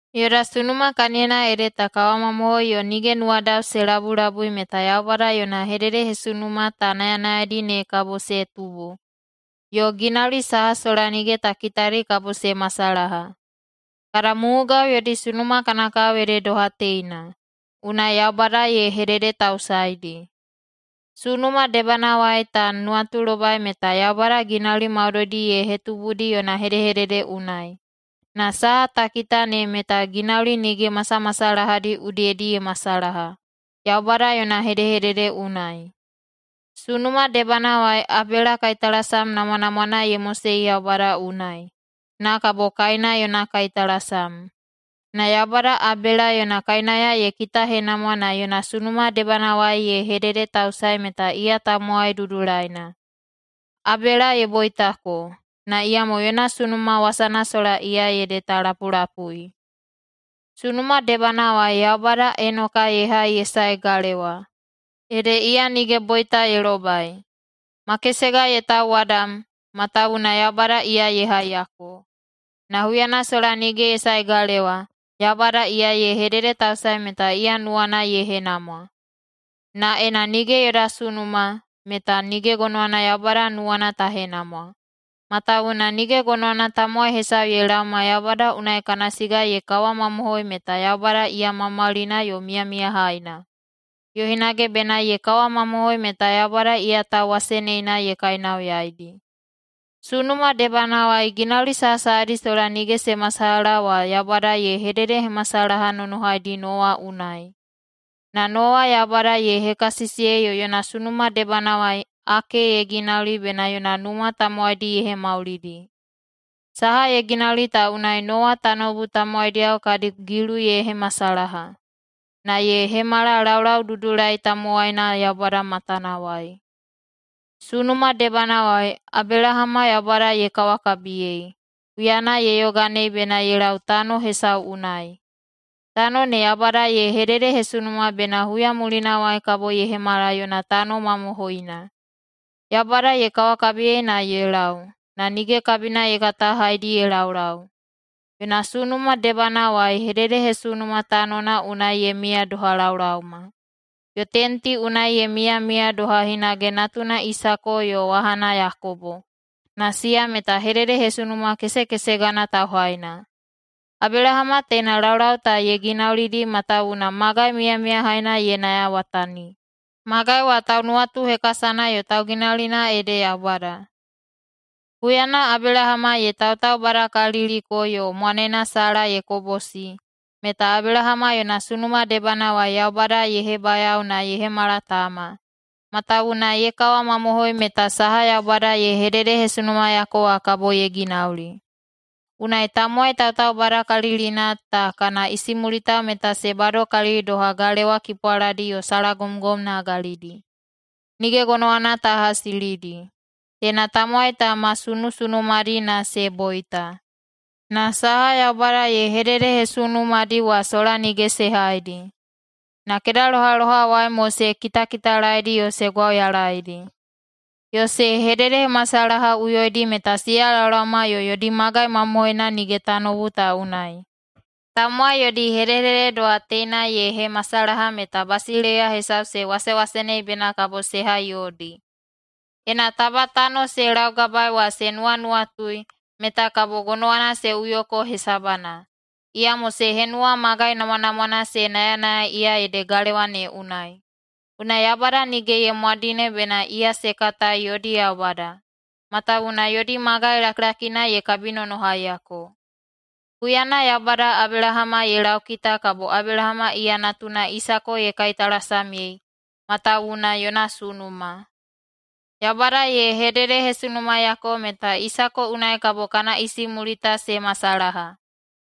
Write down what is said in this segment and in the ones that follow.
Yoda sunuma kaniyona ede ta kawamamohoi yo nige nuwadao se labulabui meta Yaubada yona hededehesunuma ta nayanayaidi ne kabo se tubu, yo ginauli saha sola nige ta kitadi kabo se masalaha. Kada mumugao yodi sunuma kana kao ede doha teina, unai Yaubada ye hededetausaedi. Sunuma debanawai ta nuwatulobai meta Yaubada ginauli maudoidi ye hetubudi yona hedehedede unai. Na saha ta kita ne meta ginauli nige masamasalahadi udiyedi ye masalaha, Yaubada yona hedehedede unai. Sunuma debanawai Abela kaitalasam namwanamwana ye mosei Yaubada unai, na kabo Kaina yona kaitalasam. Na Yaubada Abela yona kainauya ye kitahenamwa na yona sunuma debanawai ye hededetausae meta iya tamowai dudulaina. Abela ye boitako, na iyamo yona sunuma wasana sola iya ede ta lapulapui. Sunuma debanawai Yaubada Enoka ye hai ye saei galewa, ede iya nige boita ye lobai. Makesega ye tauwadam, matawuwuna Yaubada iya ye haiyako. Na huyana sola nige ye sae galewa, Yaubada iya ye hededetausae meta iya nuwana ye henamwa. Na ena nige yoda sunuma, meta nige gonowana Yaubada nuwana ta henamwa. Matawuwuna nige gonowana tamowai hesau ye laoma Yaubada unai kana siga ye kawamamohoi meta Yaubada iya maumaulina yo miyamiyahaina, yo hinage bena ye kawamamohoi meta Yaubada iya tauwaseneina ye kainauyaidi. Sunuma debanawai ginauli sahasahadi sola nige se masalaha wa Yaubada ye hededehemasalahanonohaidi Nowa unai, na Nowa Yaubada ye hekasisiyei yo yona sunuma debanawai ake ye ginauli bena yona numa tamowaidi ye hemaulidi. Saha ye ginauli ta unai Nowa tanoubu tamowaidiyao kadi gilu ye hemasalaha, na ye hemala laulaududulai tamowaina Yaubada matanawai. Sunuma debanawai Abelahama Yaubada ye kawakabiyei, huyana ye yoganei bena ye lau tano hesau unai. Tano ne Yaubada ye hededehesunuma bena huya mulinawai kabo ye hemala yona tano mamohoina. Yaubada ye kawakabiyei na ye lau, na nige kabina ye kata haedi ye laulau. Yona sunuma debanawai hededehesunuma tanona unai ye miya doha laolaoma. Yo tenti unai ye miyamiya doha hinage natuna Isako yo wahana Yakobo, na siya meta hededehesunuma kesekesegana tauhaina. Abelahama teina laulau ta ye ginaulidi matawuwuna magai miyamiyahaina ye nayawatani. Magai wa taunuwatuhekasana yo tauginaulina ede Yaubada. Huyana Abelahama ye tautaubadakaliliko yo mwanena Sala ye kobosi, meta Abelahama yona sunuma debanawai Yaubada ye hebayao na ye hemala tama, matawuwuna ye kawamamohoi meta saha Yaubada ye hededehesunumayako wa kabo ye ginauli. Unai tamowai tautaubadakalilina ta kana isimulitao meta se badokalili doha galewa kipwaladi yo salagomgom nagalidi. Nige gonowana ta hasilidi. Teina tamowai ta ma sunusunumadi na se boita. Na saha Yaubada ye hededehesunumadi wa sola nige se haidi. Na kedalohalohawai mo se kitakitalaedi yo se gwauyalaedi. Yo se hededehemasalahaꞌuyoidi meta siya laolaoma yo yodi magai mamohoina nige tanoubu ta unai. Tamowai yodi hedehedede doha teina ye hemasalaha meta basileiya hesau se wasewasenei bena kabo se hai yodi. Ena taba tano se laugabaei wa se nuwanuwatui, meta kabo gonowana se uyoko hesabana. Iyamo se henuwa magai namwanamwana se nayanayai iya ede galewa ne unai. Unai Yaubada nige ye mwadine bena iya se katai yodi Yaubada, matawuwuna yodi magai lakilakina ye kabinonohaiyako. Huyana Yaubada Abelahama ye laukita kabo Abelahama iya natuna Isako ye kaitalasamyei, matawuwuna yona sunuma. Yaubada ye hededehesunumayako meta Isako unai kabo kana isimulitao se masalaha,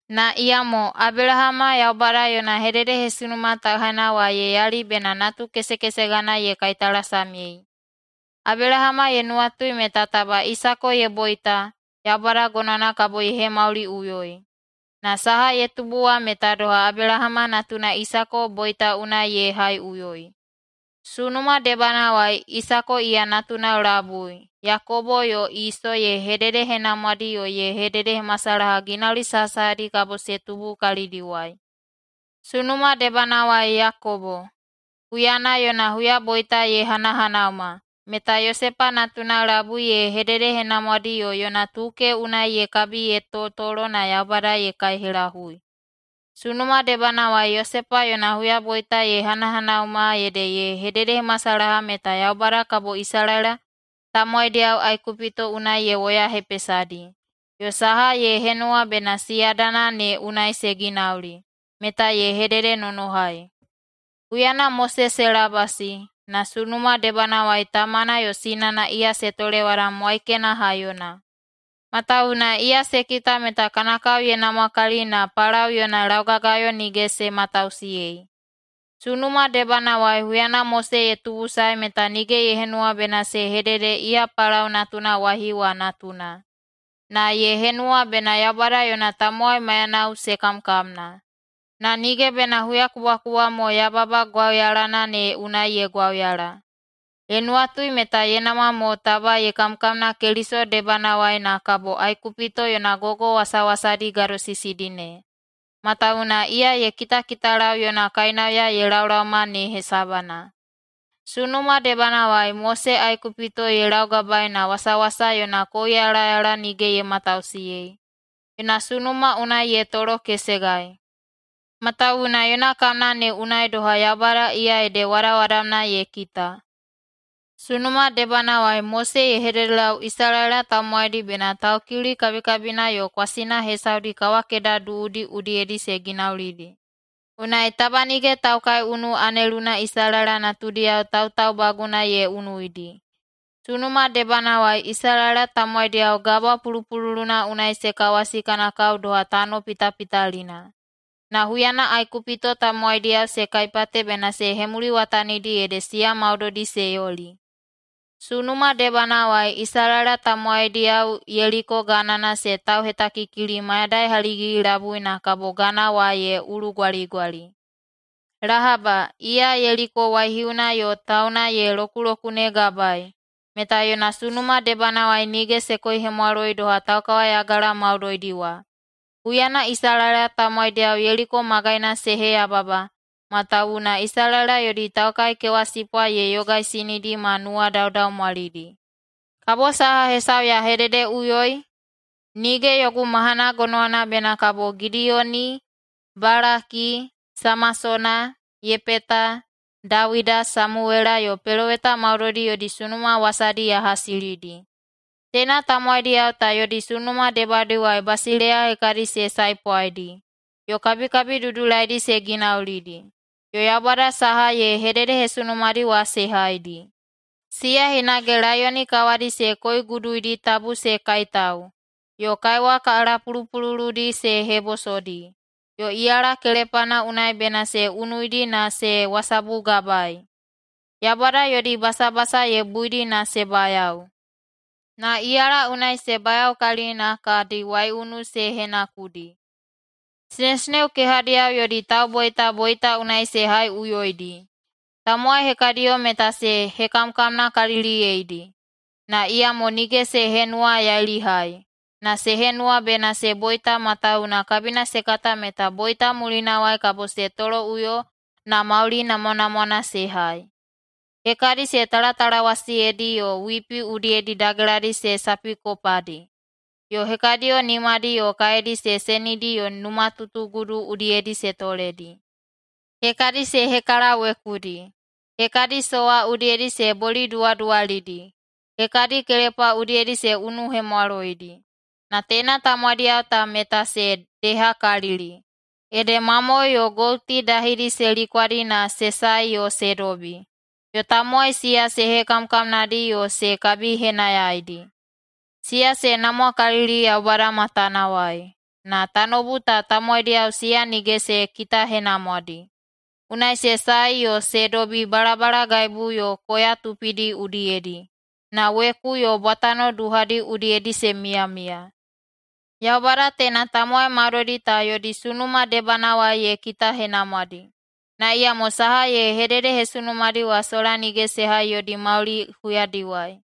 na iyamo Abelahama Yaubada yona hededehesunuma tauhaina wa ye yali bena natukesekesegana ye kaitalasamyei. Abelahama ye nuwatui meta taba Isako ye boita, Yaubada gonowana kabo ye hemauliꞌuyoi. Na saha ye tubu wa meta doha Abelahama natuna Isako boita unai ye haiꞌuyoi. Sunuma debanawai Isako iya natunao labui Yakobo yo Iso ye hededehenamwadi yo ye hededehemasalaha ginauli sahasahadi kabo se tubu kalidiwai. Sunuma debanawai Yakobo, huyana yona huyaboita ye hanahanauma, meta Yosepa natunao labui ye hededehenamwadi yo yona tuke unai ye kabi ye totolo na Yaubada ye kaihelahui. Sunuma debanawai Yosepa yona huyaboita ye hanahanauma ede ye hededehemasalaha meta Yaubada kabo Isalaela tamowaidiyao Aikupito unai ye woyahepesadi, yo saha ye henuwa bena siyadana ne unai se ginauli, meta ye hededenonohai. Huyana Mose se labasi, na sunuma debanawai tamana yo sinana iya se tolewadam waikena haiyona, matawuwuna iya se kita meta kana kao ye namwakalili, na Palao yona laugagayo nige se matausiyei. Sunuma debanawai huyana Mose ye tubusae meta nige ye henuwa bena se hedede iya Palao natuna waihiu wa natuna, na ye henuwa bena Yaubada yona tamowai maiyanao se kamkamna, na nige bena huyakubwakubwa mo yababa gwauyalana ne unai ye gwauyala. Ye nuwatui meta ye namwa mo taba ye kamkamna Keliso debanawai na kabo Aikupito yona gogo wasawasadi gadosisidi ne, matawuwuna iya ye kitakitalau yona kainauya ye laolaoma ne hesabana. Sunuma debanawai Mose Aikupito ye laugabaei na wasawasa yona kouyalayala nige ye matausiyei. Yona sunuma unai ye tolokesegai, matawuwuna yona kamna ne unai doha Yaubada iya ede wadawadamna ye kita. Sunuma debanawai Mose ye hededelau Isalaela tamowaidi bena Taukiuli kabikabina yo kwasina hesaudi kawakeda duudi udiyedi se ginaulidi, unai taba nige taukaiunu aneluna Isalaela natudiyao tautaubaguna ye unuidi. Sunuma debanawai Isalaela tamowaidiyao Gabwa Pulupululuna unai se kawasi kana kao doha tano pitapitalina. Na huyana Aikupito tamowaidiyao se kaipate bena se hemuliwatanidi ede siya maudoidi se yoli. Sunuma debanawai Isalaela tamowaidiyao Yeliko ganana se tauhetakikili mayadai haligigi-labui na kabo gana wa ye ulugwaligwali. Lahaba, iya Yeliko waihiuna yo tauna ye lokulokunegabaei, meta yona sunuma debanawai nige se koihemwaloi doha taukawayagala maudoidi wa, huyana Isalaela tamowaidiyao Yeliko magaina se heyababa, matawuwuna Isalaela yodi taukaikewasipwa ye yogaisinidi ma nuwadaudaumwalidi. Kabo saha hesau ya hededeꞌuyoi? Nige yogu mahana gonowana bena kabo Gidiyoni, Balaki, Samasona, Yepeta, Dawida, Samuwela yo peloweta maudoidi yodi sunuma wasadi ya hasilidi. Teina tamowaidiyao ta yodi sunuma debadiwai basileiya hekadi se saepwaidi, yo kabikabi dudulaidi se ginaulidi, yo Yaubada saha ye hededehesunumadi wa se haidi. Siya hinage laiyoni kawadi se koiguduidi tabu se kaitau, yo kaiwa kalapulupululudi se hebosodi, yo iyala kelepana unai bena se unuidi na se wasabugabaei. Yaubada yodi basabasa ye buidi na se bayao, na iyala unai se bayaokalili na kadi waiunu se henakudi. Sinesineo kehadiyao yodi tauboita, boita unai se haiꞌuyoidi. Tamowai hekadiyo meta se hekamkamnakaliliyeidi, na iyamo nige se henuwayailihai, na se henuwa bena se boita matawuwuna kabina se kata meta boita mulinawai kabo se toloꞌuyo na mauli namwanamwana se hai. Hekadi se talatalawasiyedi yo wipi udiyedi dageladi se sapikopadi, yo hekadiyo nimadi yo kaedi se senidi yo numatutugudu udiyedi se toledi. Hekadi se hekalawekudi, hekadi sowa udiyedi se boliduwaduwalidi, hekadi kelepa udiyedi se unuhemwaloidi. Na teina tamowaidiyao ta meta se dehakalili, ede mamoe yo gouti dahidi se likwadi na se sae yo se dobi, yo tamowai siya se hekamkamnadi yo se kabihenayaidi. Siya se namwakalili Yaubada matanawai, na tanoubu ta tamowaidiyao siya nige se kitahenamwadi. Unai se sae yo se dobi balabalagaibu yo koya tupidi udiyedi, na weku yo bwatano duhadi udiyedi se miyamiya. Yaubada teina tamowai maudoidi ta yodi sunuma debanawai ye kitahenamwadi, na iyamo saha ye hededehesunumadi wa sola nige se hai yodi mauli huyadiwai.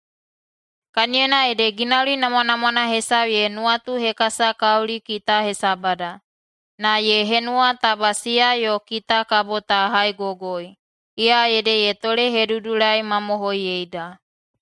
Kaniyona ede ginauli namwanamwana hesau ye nuwatuhekasakauli kita hesabada, na ye henuwa taba siya yo kita kabo ta haigogoi, iya ede ye tolehedudulaimamohoiyeida.